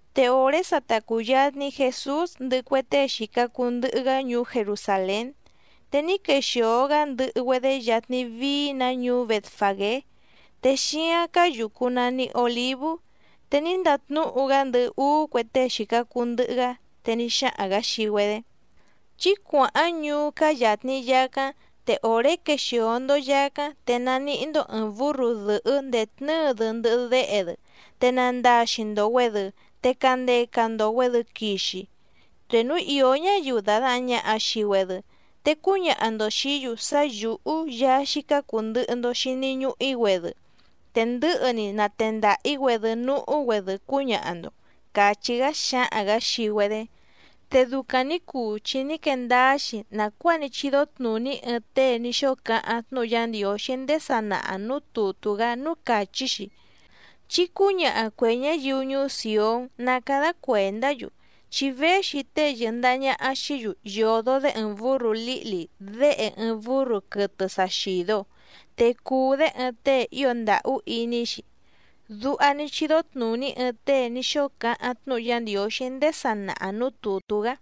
Te òré sa ta cùyatni Jesús ndɨhɨ cue tée xìca cuu ndɨhɨ‑gá ñuú Jerusàlén, te ní quexìo‑gá ndɨhɨ‑güedé yatni vií‑nǎ ñuú Bètfagé, te xíáⁿ cáá yùcu nani Olívú. Te ní ndatnúhu‑gá ndɨhɨ úú cue tée xìca cuu ndɨhɨ‑gá, te ní xáhaⁿ‑gǎ xii‑güedé: —Chí cuàháⁿ ñuú cáá yàtni yacáⁿ, te òré quexìo‑ndo yacáⁿ te nanihí‑ndó ɨ̀ɨⁿ búrru dɨ̀hɨ́ ndètnɨ́ɨ‑dɨ ndɨhɨ déhe‑dɨ, te nandaxi‑ndo‑güèdɨ te candeca‑ndo‑güèdɨ quixi. Te núu ìó ñáyiu dàdahaⁿ ñaha xii‑güedɨ, te cúñaha‑ndo xìí‑yu sá yǔhú Yaá xícá cùu ndɨhɨ‑ndo xini ñuhu‑í‑güedɨ, te ndɨ̌hɨ‑ni natendaha‑ǐ‑güedɨ núhú‑güedɨ cúñaha‑ndo —càchí‑gá xǎhaⁿ‑gǎ xii‑güedé. Te ducaⁿ nǐ cuu chi ní quee ndáá‑xi nàcuáa ní chídó tnùní ɨɨⁿ tée ní xóo cáháⁿ tnúhu Yá Ndiǒxí ndéé sanaha nǔú tùtú‑gá núú càchí‑xi: Chí cǔñaha cuè ñáyiu ñuú Sìón ná cádá cuèndá‑yu, chi véxi tée yɨ̀ndaha ñaha xií‑yu yòdo‑dé ɨɨⁿ bǔrru lǐhli déhe ɨɨⁿ bǔrru quɨtɨ sa xìdo, te cùu‑dé ɨɨⁿ tée ío ndàhú iní‑xi. Duha ní chídó tnùní ɨɨⁿ tée ní xóo cáháⁿ tnúhu Yá Ndiǒxí ndéé sanaha nǔú tùtú‑gá.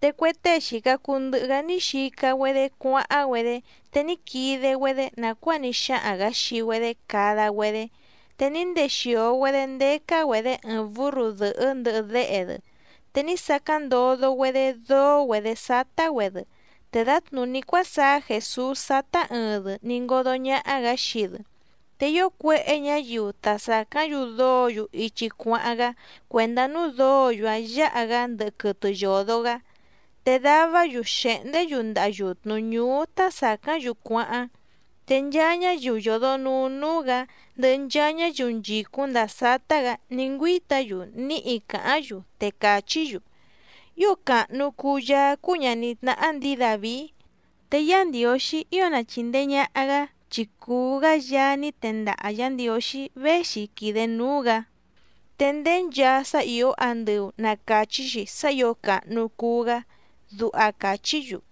Te cue tée xìca cuu ndɨhɨ‑gá ní xica‑güedé cuáháⁿ‑güedé, te ní quide‑güedé nàcuáa ní xáhaⁿ‑gǎ xii‑güedé cada‑güedé. Te ní ndexìo‑güedé ndécá‑güedě ɨɨⁿ bǔrru dɨ̀hɨ́ ndɨhɨ déhe‑dɨ, te ní sacáⁿ ndodo‑güedé dóó‑güedě sátá‑güedɨ, te dǎtnùní cuásaá Jèsús sátá ɨɨⁿ‑dɨ ní ngódó ñàha‑gá xii‑dɨ. Te ío cuéhé ñǎyiu ta sàcáⁿ‑yu dóǒ‑yu ichi cuáháⁿ‑gá cuèndá núú dǒǒ‑yu‑áⁿ yǎha‑gá ndɨhɨ quɨtɨ yòdo‑gá. Te davá‑yu xèhndé‑yu ndaha yùtnu ñúú tá sàcáⁿ‑yu cuáháⁿ. Te nchaa ñáyiu yòdonuu núú‑gǎ ndɨhɨ nchaa ñáyiu nchìcúⁿ ndàa sátá‑gǎ ní ngüíta‑yu níhi càháⁿ‑yu, te càchí‑yu: —¡Ío càhnu cuu Yaá cúú ñàní tnáhá ndǐi Dàvií! ¡Te Yá Ndiǒxí ío na chìndee ñaha‑gá chi cùu‑gá Yaá ní tendaha Yǎ Ndiǒxí véxi quìde núú‑gǎ! ¡Te ndéé nchaa sá ìó andɨu na càchí‑xi sá ǐo càhnu cuu‑gá! —duha càchí‑yu.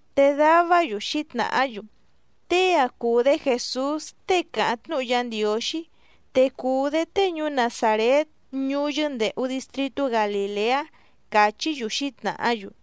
Te davá‑yu xǐtnàhá‑yu: —Tée‑ǎⁿ cúú‑dě Jèsús tée càháⁿ tnúhu Yá Ndiǒxí, te cùu‑dé tée ñuú Nazàrét ñuú yɨ́ndèhu distritú Galìleá —càchí‑yu xǐtnàhá‑yu.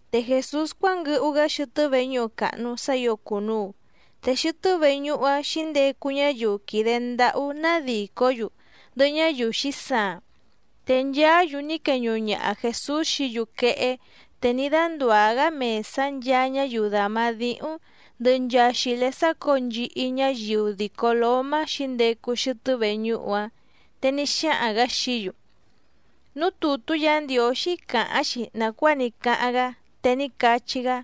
Te Jèsús cuánguɨhu‑gá xɨtɨ́ veñúhu càhnu sá ǐo cùnuu, te xɨtɨ́ veñúhu‑áⁿ xǐndecu ñáyiu quìde ndáhú nádìcó‑yu, ndɨhɨ ñáyiu xǐsaaⁿ, te nchaá‑yu ní queñuhu ñaha Jèsús xií‑yu quehé, te ní dándùá‑gá mèsá nchaa ñáyiu dàma díhúⁿ, ndɨhɨ nchaa xìlé sácǒo nchihi ñáyiu dìco lómá xǐndecu xɨtɨ́ veñúhu‑áⁿ. Te ní xáhaⁿ‑gǎ xií‑yu: —Núú tùtú Yǎ Ndiǒxí càháⁿ‑xi nàcuáa ní cáháⁿ‑gá, te ní cachí‑gá: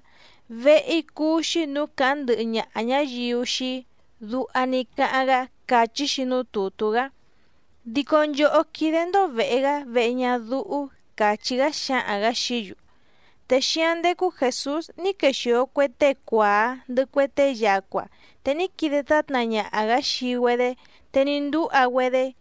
“Vehe‑í cúú‑xí nǔú càháⁿ ndɨhɨ ñaha ñǎyiu xii‑í”, duha ní cáháⁿ‑gá càchí‑xi núú tùtú‑gá. Dico nchòhó quídé‑ndó vèhe‑gá vehe ñadúhú —càchí‑gá xǎhaⁿ‑gǎ xií‑yu. Te xíáⁿ ndécú Jèsús ní quexìo cue tée cuàá ndɨhɨ cue tée yacua, te ní quide tátna ñaha‑gǎ xii‑güedé te ní ndúha‑güedé.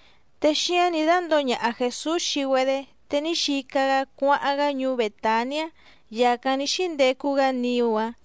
Te xíáⁿ nǐ dándǒo ñaha Jèsús xii‑güedé, te ní xica‑gá cuáháⁿ‑gá ñuú Bètaniá, yàcáⁿ ní xíndecu‑gá niú‑áⁿ.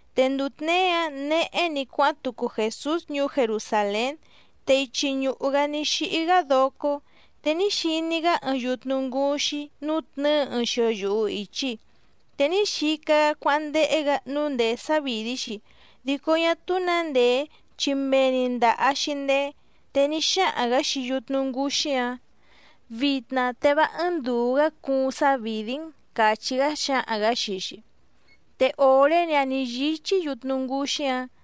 Te nduu tněé‑áⁿ nehé‑ni cuáháⁿ tucu Jèsús ñuú Jerusàlén, te ichi ñùhu‑gá ní xíhí‑gá docó. Te ní xiní‑gá ɨɨⁿ yutnu ngǔxí nútnɨ̌ɨ ɨɨⁿ xio yuhu ìchi, te ní xica‑gá cuáháⁿ ndéhé‑gǎ nǔu ndèé sávìdí‑xi, dico ñá túú nǎ ndèé chi mee‑ni ndàha‑xi ndeé. Te ní xáhaⁿ‑gǎ xii yutnu ngǔxí‑áⁿ: —¡Vitna te vá ɨ́ɨ́ⁿ ndùu‑gá cuuⁿ sávìdí‑n! —càchí‑gá xǎhaⁿ‑gǎ xii‑xi. Te òré‑ni‑áⁿ nǐ yíchí yutnu ngǔxí‑áⁿ.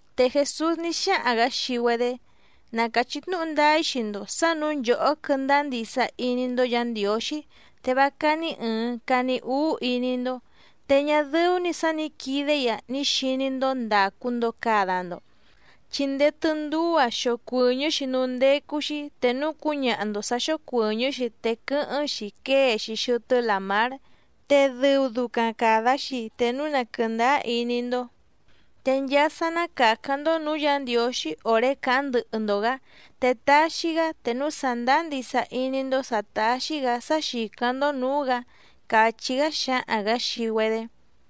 Te Jèsús ní xáhaⁿ‑gǎ xii‑güedé: —Na càchí tnúhu ndáá‑í xii‑ndo sǎ nǔu nchòhó quɨ́ndáá ndisa iní‑ndó Yǎ Ndiǒxí, te vá cání ɨ̀ɨⁿ cani úú iní‑ndó, te ñá dɨ́ú‑ní sǎ nǐ quide‑í‑a ní xiní‑ndó ndàcu‑ndo cada‑ndo, chi ndéé tɨ́ndúú‑a xocuɨ̀ñɨ́‑xi núú ndécú‑xí te núu cúñaha‑ndo sǎ xócuɨ̀ñɨ́‑xi te quɨ́hɨ́ⁿ‑xi quée‑xi xɨtɨ́ làmár. Te dɨu ducaⁿ càda‑xi te núu na quɨ̀ndáá iní‑ndó. Te nchaa sá ná càcáⁿ‑ndó nǔú Yǎ Ndiǒxí òré càháⁿ ndɨhɨ‑ndo‑gǎ te taxi‑gá te núu sàndáá ndisa iní‑ndó sǎ táxí‑gǎ sá xìcáⁿ‑ndó nǔú‑gǎ —càchí‑gá xǎhaⁿ‑gǎ xii‑güedé.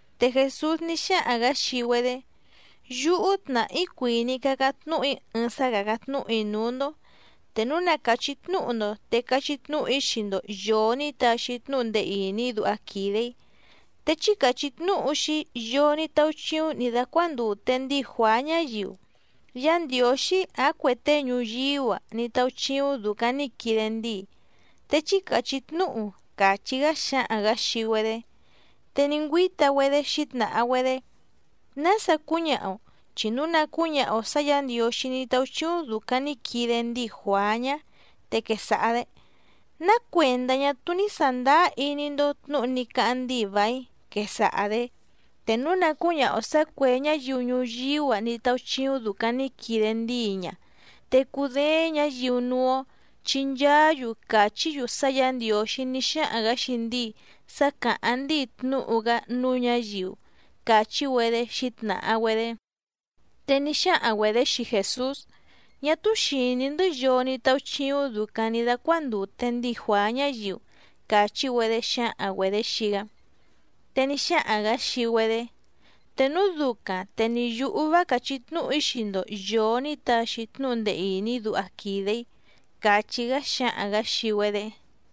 Te Jèsús ní xáhaⁿ‑gǎ xii‑güedé: —Yúhú tnàhá‑í cuìní‑í cácáⁿ tnúhu‑í ɨɨⁿ sá càcáⁿ tnúhu‑í núú‑ndó, te núu na càchí tnúhu‑ndo te cachí tnúhu‑í xii‑ndo yòo ní taxi tnúhu ndee ìní duha quìde‑í. Te chí càchí tnúhu xii‑í yoo ní táúchíúⁿ nǐ dácuándùte ndíi Juàá ñáyiu, ¿Yá Ndiǒxí ǎⁿ cuè tée ñuyíú‑a ní táúchíúⁿ dùcaⁿ ní quide ndíi?, te chí càchí tnúhu —càchí‑gá xǎhaⁿ‑gǎ xii‑güedé. Te ní ngüíta‑güedé xǐtnàha‑güedé: —¿Nása cúñaha‑o? Chi núu na cǔñaha‑o sǎ Yǎ Ndiǒxí ní táúchíúⁿ dùcaⁿ ní quide ndíi Juàá ñá, te quesaha‑dě: “¿Ná cuèndá ñá túú ní sàndáá iní‑ndó tnǔhu ní cáháⁿ ndíi vàíⁿ?”, quesaha‑dě. Te núu na cǔñaha‑o sǎ cuè ñáyiu ñuyíú‑a ní táúchíúⁿ dùcaⁿ ní quide ndíi ña, te cudééⁿ ñǎyiu núú‑ó, chi nchaá‑yu càchí‑yu sá Yǎ Ndiǒxí ní xáhaⁿ‑gǎ xii ndíi sá càháⁿ ndíi tnúhu‑gá núú ñǎyiu —càchí‑güedé xǐtnàha‑güedé. Te ní xáhaⁿ‑güedě xii Jèsús: —Ñá túú xìní‑ndɨ́ yoo ní táúchíúⁿ dùcaⁿ ní dácuándùte ndíi Juàá ñáyiu —càchí‑güedé xǎhaⁿ‑güedě xii‑gá. Te ní xáhaⁿ‑gǎ xii‑güedé: —Te núu ducaⁿ te ni yǔhú vá càchí tnúhu‑í xii‑ndo yòo ní taxi tnúhu ndee ìní duha quìde‑í —càchí‑gá xǎhaⁿ‑gǎ xii‑güedé.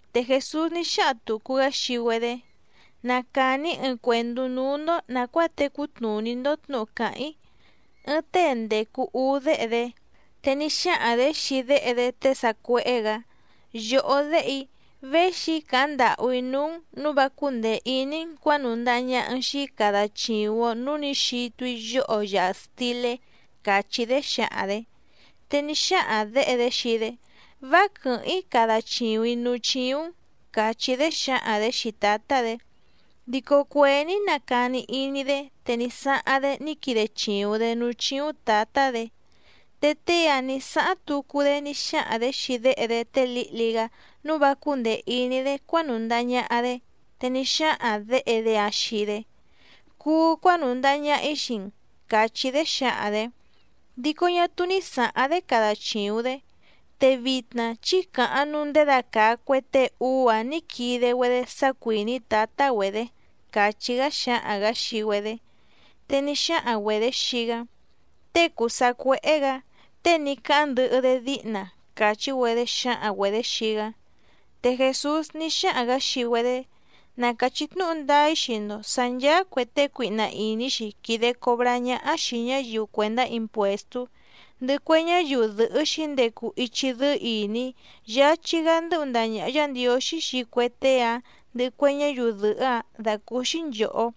Te Jèsús ní xáhaⁿ tùcu‑gá xii‑güedé: —Na càni‑í ɨɨⁿ cuèndú núú‑ndó nàcuáa tecú tnùní‑ndó tnǔhu càháⁿ‑í. Ɨɨⁿ tée ndècu úú déhe‑dé, te ní xáhaⁿ‑dě xii déhe‑dé tée sacuéhé‑gǎ: “Yòhó déhe‑í, véxi‑í càháⁿ ndàhú‑í núú‑n nǔu vá cúndèe iní‑n cuǎnùndaha ñaha‑n xii‑í cada chìuⁿ‑o núú nǐ xitu‑í yoho yàha stilé”, càchí‑dé xǎhaⁿ‑dě. Te ní xáhaⁿ děhe‑dé xii‑dé: “Vá quɨ̀hɨ́ⁿ‑í cada chìuⁿ‑í núú chíúⁿ‑n”, càchí‑dé xǎhaⁿ‑dě xii tǎtá‑dě. Dico cuèé ní nacani iní‑dé te ní sáháⁿ‑dé ní quide chìuⁿ‑dé núú chíúⁿ tǎtá‑dě. Te tée‑áⁿ nǐ sáháⁿ tucu‑dé ní xáhaⁿ‑dě xii déhe‑dé té lǐhli‑gá nǔu vá cúndèe iní‑dé cuánùndaha ñaha‑dé, te ní xáhaⁿ děhe‑dé‑áⁿ xii‑dé: “Cuu cuánùndaha ñaha‑í xii‑n”, càchí‑dé xǎhaⁿ‑dě. Dico ñá túú ní sǎháⁿ‑dé cada chìuⁿ‑dé. Te vitna chí càháⁿ nǔu ndědacàa cue tée úú‑áⁿ nǐ quide‑güedé sá cuìní tǎtá‑güedě —càchí‑gá xǎhaⁿ‑gǎ xii‑güedé. Te ní xáhaⁿ‑güedě xii‑gá: —Tée cùu sacuéhé‑gǎ, tée ní cáháⁿ ndɨhɨ‑dé díhna —càchí‑güedé xǎhaⁿ‑güedě xii‑gá. Te Jèsús ní xáhaⁿ‑gǎ xii‑güedé: —Na càchí tnúhu ndáá‑í xii‑ndo sǎ ncháá cuè tée cuihna ìní‑xi quìde cobrá ñáhá xìi ñáyiu cuèndá impuèstú, ndɨhɨ cue ñáyiu dɨ̀hɨ́ xǐndecu ichi dɨ́ɨ́ ìní yáchí‑gá ndɨ́hu ndaha ñàha Yá Ndiǒxí xii cue tée‑áⁿ ndɨhɨ cue ñáyiu dɨ̀hɨ́‑áⁿ dàcúúxí nchòhó.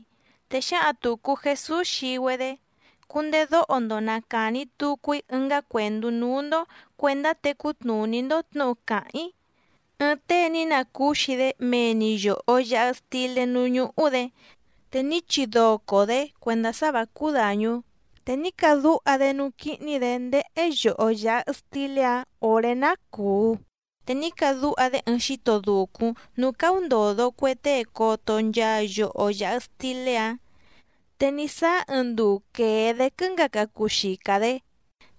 Te xǎhaⁿ tùcu Jesús xii‑güedé: —Cundedóho‑ndo na càni tucu‑í ɨngá cuèndú núú‑ndó cuèndá tecú tnùní‑ndó tnǔhu càháⁿ‑í. Ɨɨⁿ tée ní nacúxi‑dé mee‑ni yòho yaha stilé núú ñúhú‑dě, te ní chidoco‑dě cuèndá sá vǎ cúú dàñú, te ní cadúha‑dé núú quíhní‑dě ndéhé yoho yàha stilé‑áⁿ òré ná cùu, te ní cadúha‑dé ɨɨⁿ xíto dùcúⁿ núú cáúndòdo cue tée coto nchaa yoho yàha stilé‑áⁿ. ’Te ní sáá ɨɨⁿ nduu quèe‑dé quɨ́ngaca cuu xica‑dě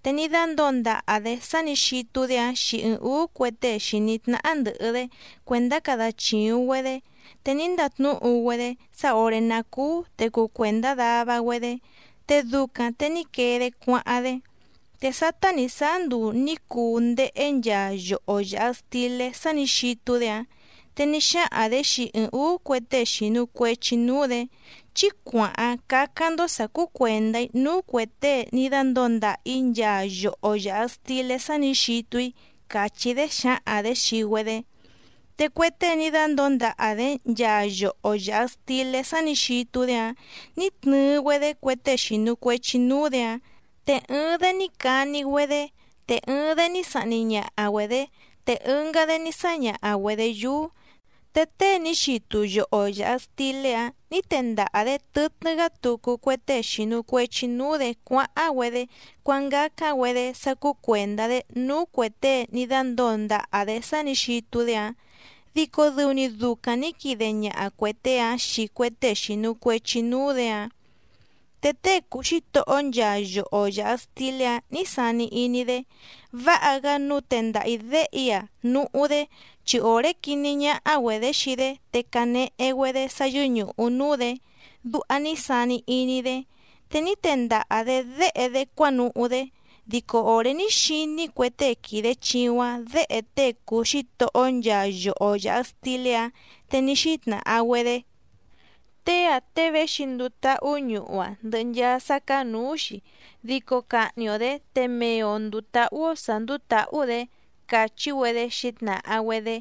te ní dándǒo ndaha‑dě sá nǐ xitu‑dé‑áⁿ xii ɨɨⁿ ǔú cue tée xìní tnáhá ndɨ̀hɨ‑dé cuèndá cada chìuⁿ‑güedé, te ní ndatnúhu‑güedé sá òré ná cúú te cuu cuèndá dava‑güedé, te ducaⁿ te ní quee‑dé cuáháⁿ‑dé. Te sátá nǐ sáá nduu nǐ cuu ndéhé nchaa yoho yàha stilé sá nǐ xitu‑dé‑áⁿ, te ní xáhaⁿ‑dě xii ɨɨⁿ ǔú cue tée xìnu cuechi núú‑dě: “Chí cuàháⁿ cácáⁿ‑ndó sǎ cúú cuèndá‑í núú cuè tée ní dándǒo ndàha‑í nchaa yoho yàha stilé sá nǐ xitu‑í”, càchí‑dé xǎhaⁿ‑dě xii‑güedé. Te cue tée ní dándǒo ndaha‑dě nchaa yoho yàha stilé sá nǐ xitu‑dé‑áⁿ nǐ tnɨɨ‑güedé cue tée xìnu cuechi núú‑dě‑áⁿ, te ɨɨⁿ‑dé ní cani‑güedé, te ɨɨⁿ‑dé ní sahni ñaha‑güedě, te ɨngá‑dé ní sáñaha‑güedě yúú. Te tée ní xitu yoho yàha stilé‑áⁿ nǐ tendaha‑dě tɨtnɨ́‑gá tucu cue tée xìnu cuechi núú‑dě cuáháⁿ‑güedé cuángácáⁿ‑güedé sá cúú cuèndá‑dé núú cuè tée ní dándǒo ndaha‑dě sá nǐ xitu‑dé‑áⁿ, dico dɨu‑ni ducaⁿ nǐ quide ñaha cuè tée‑áⁿ xii cue tée xìnu cuechi núú‑dě‑áⁿ. ’Te tée cùu xítohó nchaa yoho yàha stilé‑áⁿ nǐ sani iní‑dé: “Váha‑gá nǔu tendaha‑ǐ déhe‑í‑a núhú‑dé, chi òré quiní ñáhá‑güedě xii‑dé te canehe‑güedé sá yɨ́ñùhu núú‑dě”, duha ní sani iní‑dé. Te ní tendaha‑dě déhe‑dé cuánuhú‑dé. Dico òré ní xiní cue tée quìde chiuⁿ‑áⁿ děhe tée cùu xítohó nchaa yoho yàha stilé‑áⁿ, te ní xítnàha‑güedé: “Tée‑ǎⁿ tée véxi nduu táhú ñuhu‑a ndɨhɨ nchaa sá cáá nǔú‑xi, dico cahni‑o‑dě te mee‑o ndùu táhú‑ó sǎ ndúú tǎhú‑dě”, càchí‑güedé xǐtnàha‑güedé.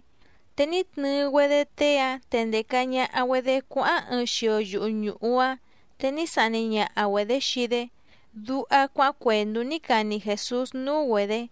Te ní tnɨɨ‑güedé tée‑áⁿ te ndèca ñaha‑güedé cuáháⁿ ɨɨⁿ xio yuhu ñùhu‑áⁿ, te ní sahni ñaha‑güedě xii‑dé —duha cuáháⁿ cuèndú ní cani Jèsús núú‑güedě.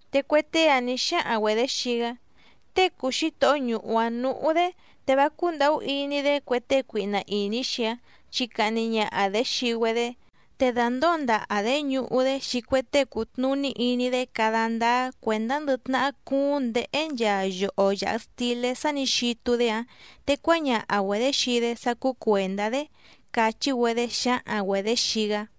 Te cue tée‑áⁿ nǐ xáhaⁿ‑güedě xii‑gá: —Tée cùu xítohó ñuhu‑áⁿ nǔhú‑dé, te vá cúndàhú iní‑dé cue tée cuihna ìní‑xi‑áⁿ chi cahni ñaha‑dě xii‑güedé, te dàndóo ndaha‑dě ñuhu‑dé xii cue tée cùtnuní iní‑dé cada ndáá cuèndá ndɨ tnahá cúúⁿ nděhé nchaa yoho yàha stilé sá nǐ xitu‑dé‑áⁿ te cuáñaha‑güedě xii‑dé sá cúú cuèndá‑dé —càchí‑güedé xǎhaⁿ‑güedě xii‑gá.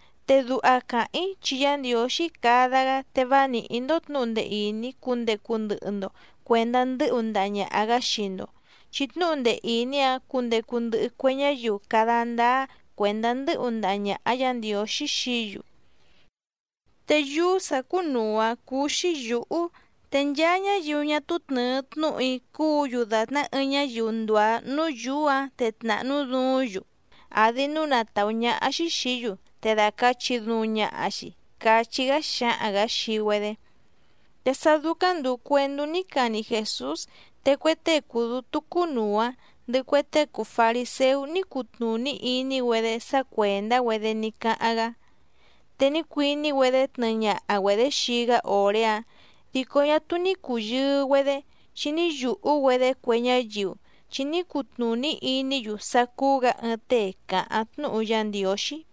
Te duha càháⁿ‑í chi Yá Ndiǒxí cada‑gá te vá nìhí‑ndó tnǔhu ndee ìní cundecu ndɨhɨ‑ndo cuèndá ndɨ́hu ndaha ñàha‑gá xii‑ndo, chi tnúhu ndee ìní‑áⁿ cundecu ndɨhɨ cue ñáyiu cada ndáá cuèndá ndɨ́hu ndaha ñàha Yá Ndiǒxí xií‑yu. Te yúú sǎ cúnùu‑áⁿ cúú‑xí yǔhú, te nchaa ñáyiu ñá túú tnɨ̀ɨ tnúhu‑í cùú‑yu dàtná ɨɨⁿ ñáyiu ndùá núú yǔú‑ǎⁿ te tnàhnú duúⁿ‑yu, àdi núu na tàú ñáhá‑xí xìí‑yu, te dacàchi duuⁿ ñaha‑xi —cachí‑gá xǎhaⁿ‑gǎ xii‑güedé. Te sá dúcáⁿ ndùu cuendú ní cani Jèsús te cue tée cùu dútú cúnùu‑áⁿ, ndɨhɨ cue tée cùu fariséú ní cutnùní iní‑güedé sá cuèndá‑güedé ní cáháⁿ‑gá. Te ní cuiní‑güedé tnɨɨ ñaha‑güedě xii‑gá òré‑áⁿ dico ñá túú ní cùyɨɨ‑güedé, chi ní yùhú‑güedé cue ñáyiu, chi ní cutnùní iní‑yu sá cúú‑gǎ ɨɨⁿ tée càháⁿ tnúhu Yá Ndiǒxí.